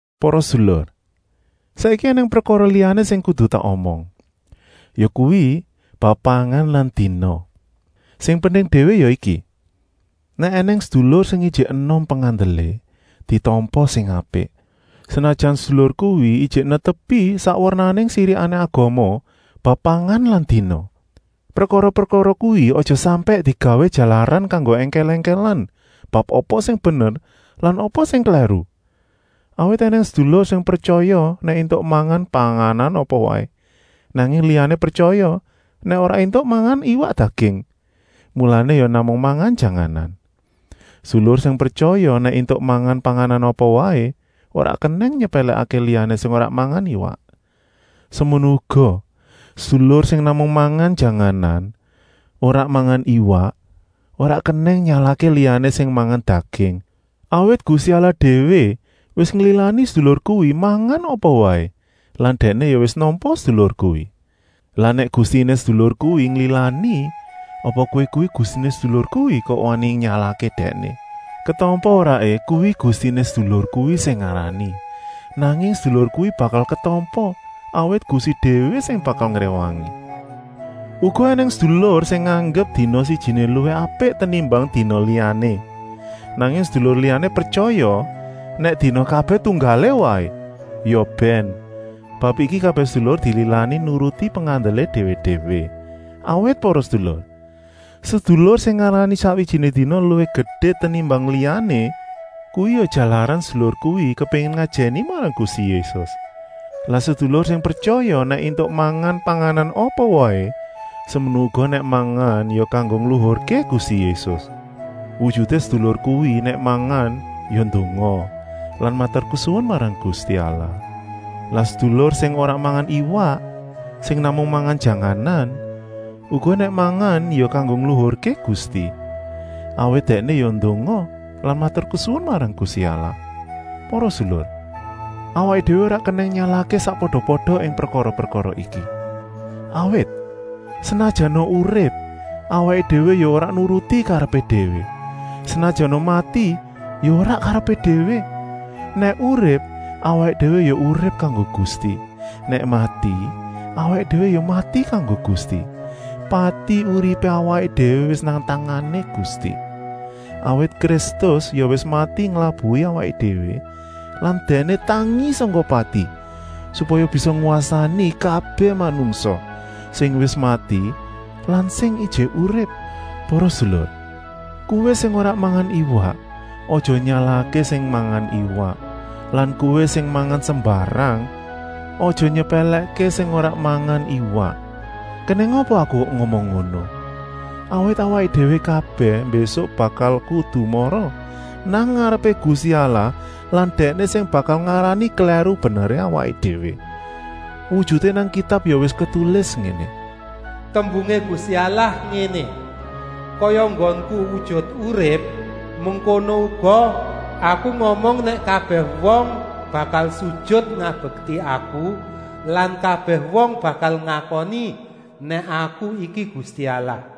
Para sedulur, saiki ènèng prekara liyané sing kudu tak omong, yakuwi, bab pangan lan dina. Sing penting déwé ya iki: nèk ènèng sedulur sing ijik enom pengandelé, ditampa sing apik, senajan sedulur kuwi ijik netepi sak wernané sirikané agama bab pangan lan dina. Prekara-prekara kuwi aja sampèk digawé jalaran kanggo èngkèl-èngkèlan bab apa sing bener lan apa sing klèru. Awit ènèng sedulur sing pretyaya nèk éntuk mangan panganan apa waé, nanging liyané pretyaya nèk ora éntuk mangan iwak daging, mulané ya namung mangan janganan. Sedulur sing pretyaya nèk éntuk mangan panganan apa waé ora kenèng nyepèlèkké liyané sing ora mangan iwak. Semono uga, sedulur sing namung mangan janganan, ora mangan iwak, ora kenèng nyalahké liyané sing mangan daging, awit Gusti Allah déwé wis nglilani sedulur kuwi mangan apa waé lan Dèkné ya wis nampa sedulur kuwi. Lah nèk Gustiné sedulur kuwi nglilani, apa kowé kuwi Gustiné sedulur kuwi kok wani nyalahké dèkné. Ketampa-oraé kuwi Gustiné sedulur kuwi sing ngarani. Nanging sedulur kuwi bakal ketampa, awit Gusti déwé sing bakal ngréwangi. Uga ènèng sedulur sing nganggep dina sijiné luwih apik tenimbang dina liyané. Nanging sedulur liyané pretyaya nèk dina kabèh tunggalé waé. Ya bèn, bab iki kabèh sedulur dililani nuruti pengandelé déwé-déwé. Awit para sedulur, sedulur sing ngarani sakwijiné dina luwih gedé tenimbang liyané kuwi ya jalaran sedulur kuwi kepéngin ngajèni marang Gusti Yésus. Lah sedulur sing pretyaya nèk éntuk mangan panganan apa waé semono uga nèk mangan ya kanggo ngluhurké Gusti Yésus. Wujuté sedulur kuwi nèk mangan ya ndonga lan maturkesuwun marang Gusti Allah. Lah sedulur sing ora mangan iwak, sing namung mangan janganan, uga nèk mangan ya kanggo ngluhurké Gusti, awit dèkné ya ndonga lan maturkesuwun marang Gusti Allah. Para sedulur, awaké déwé ora kenèng nyalahké sakpada-pada ing prekara-prekara iki. Awit, senajana urip, awaké déwé ya ora nuruti karepé déwé, senajana mati ya ora karepé déwé. Nèk urip, awaké déwé ya urip kanggo Gusti, nèk mati, awaké déwé ya mati kanggo Gusti. Pati-uripé awaké déwé wis nang tangané Gusti. Awit Kristus ya wis mati nglabuhi awaké déwé lan Dèkné tangi sangka pati, supaya bisa ngwasani kabèh manungsa, sing wis mati lan sing ijik urip. Para sedulur, kowé sing ora mangan iwak, aja nyalahké sing mangan iwak lan kowé sing mangan sembarang, aja nyepèlèkké sing ora mangan iwak. Kenèng apa aku kok ngomong ngono? Awit awaké déwé kabèh mbésuk bakal kudu mara nang ngarepé Gusti Allah lan Dèkné sing bakal ngarani klèru-beneré awaké déwé. Wujuté nang Kitab ya wis ketulis ngéné: “Tembungé Gusti Allah ngéné: Kaya enggonku wujut urip, mengkono uga Aku ngomong nèk kabèh wong bakal sujut ngabekti Aku lan kabèh wong bakal ngakoni nèk Aku iki Gusti Allah.”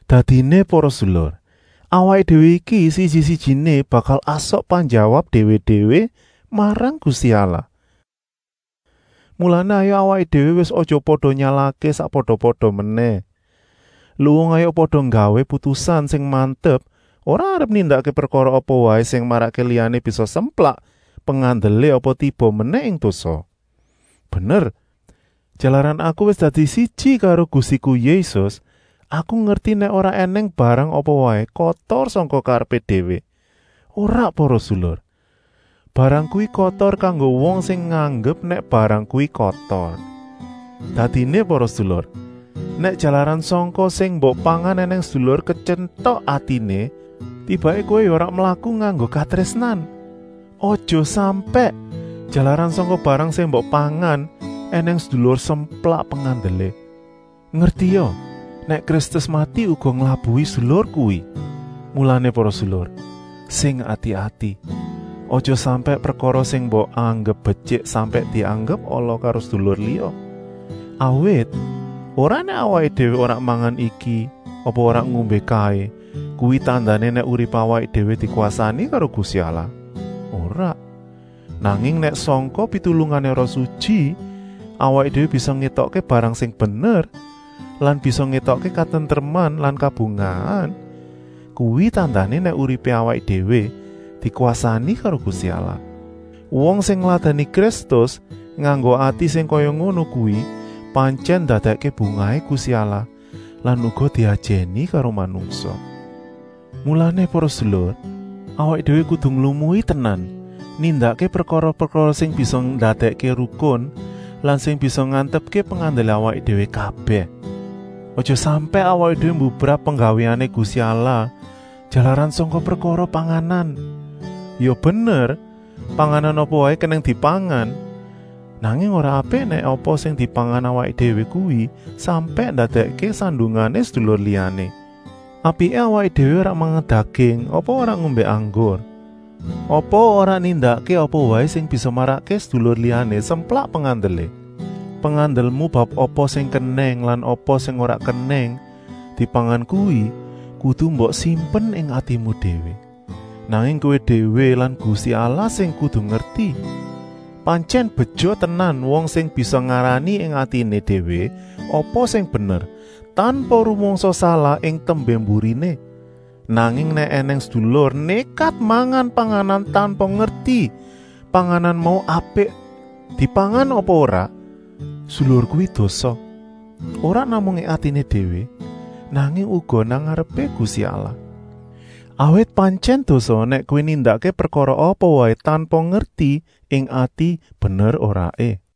Dadiné para sedulur, awaké déwé iki siji-sijiné bakal asok penjawab déwé-déwé marang Gusti Allah. Mulané hayuk awaké déwé wis aja pada nyalahké sakpada-pada menèh. Luwung hayuk pada nggawé putusan sing mantep ora arep nindakké prekara apa waé sing marakké liyané bisa semplak pengandelé apa tiba menèh ing dosa. Bener, jalaran aku wis dadi siji karo Gustiku Yésus, aku ngerti nèk ora ènèng barang apa waé kotor sangka karepé déwé, ora para sedulur. Barang kuwi kotor kanggo wong sing nganggep nèk barang kuwi kotor. Dadiné para sedulur, nèk jalaran sangka sing mbok pangan ènèng sedulur ketyentok atiné, tibaké kowé ya ora mlaku nganggo katrésnan. Aja sampèk, jalaran sangka barang sing mbok pangan, ènèng sedulur semplak pengandelé. Ngertia nèk Kristus mati uga nglabuhi sedulur kuwi. Mulané para sedulur, sing ati-ati, aja sampèk prekara sing mbok anggep betyik sampèk dianggep ala karo sedulur liya. Awit, ora nèk awaké déwé ora mangan iki apa ora ngombé kaé kuwi tandané nèk uripé awaké déwé dikwasani karo Gusti Allah, ora! Nanging nèk sangka pitulungané Roh Sutyi awaké déwé bisa ngétokké barang sing bener lan bisa ngétokké katentreman lan kabungahan, kuwi tandané nèk uripé awaké déwé dikwasani karo Gusti Allah. Wong sing ngladèni Kristus nganggo ati sing kaya ngono kuwi pantyèn ndadèkké bungahé Gusti Allah lan uga diajèni karo manungsa. Mulané para sedulur, awaké déwé kudu nglumui tenan nindakké prekara-prekara sing bisa ndadèkké rukun lan sing bisa ngantepké pengandelé awaké déwé kabèh. Aja sampèk awaké déwé mbubrah penggawéané Gusti Allah jalaran sangka prekara panganan. Ya bener, panganan apa waé kenèng dipangan, nanging ora apik nèk apa sing dipangan awaké déwé kuwi sampèk ndadèkké sandungané sedulur liyané. Apiké awaké déwé ora mangan daging apa ora ngombé anggur apa ora nindakké apa waé sing bisa marakké sedulur liyané semplak pengandelé. Pengandelmu bab apa sing kenèng lan apa sing ora kenèng dipangan kuwi kudu mbok simpen ing atimu déwé, namung kowé déwé lan Gusti Allah sing kudu ngerti. Pantyèn beja tenan wong sing bisa ngarani ing atiné déwé apa sing bener, tanpa rumangsa salah ing tembé-mburiné. Nanging nèk ènèng sedulur nékat mangan panganan tanpa ngerti panganan mau apik dipangan apa ora, sedulur kuwi dosa, ora namung ing atiné déwé, nanging uga nang ngarepé Gusti Allah. Awit pantyèn dosa nèk kowé nindakké prekara apa waé tanpa ngerti ing ati bener-oraé.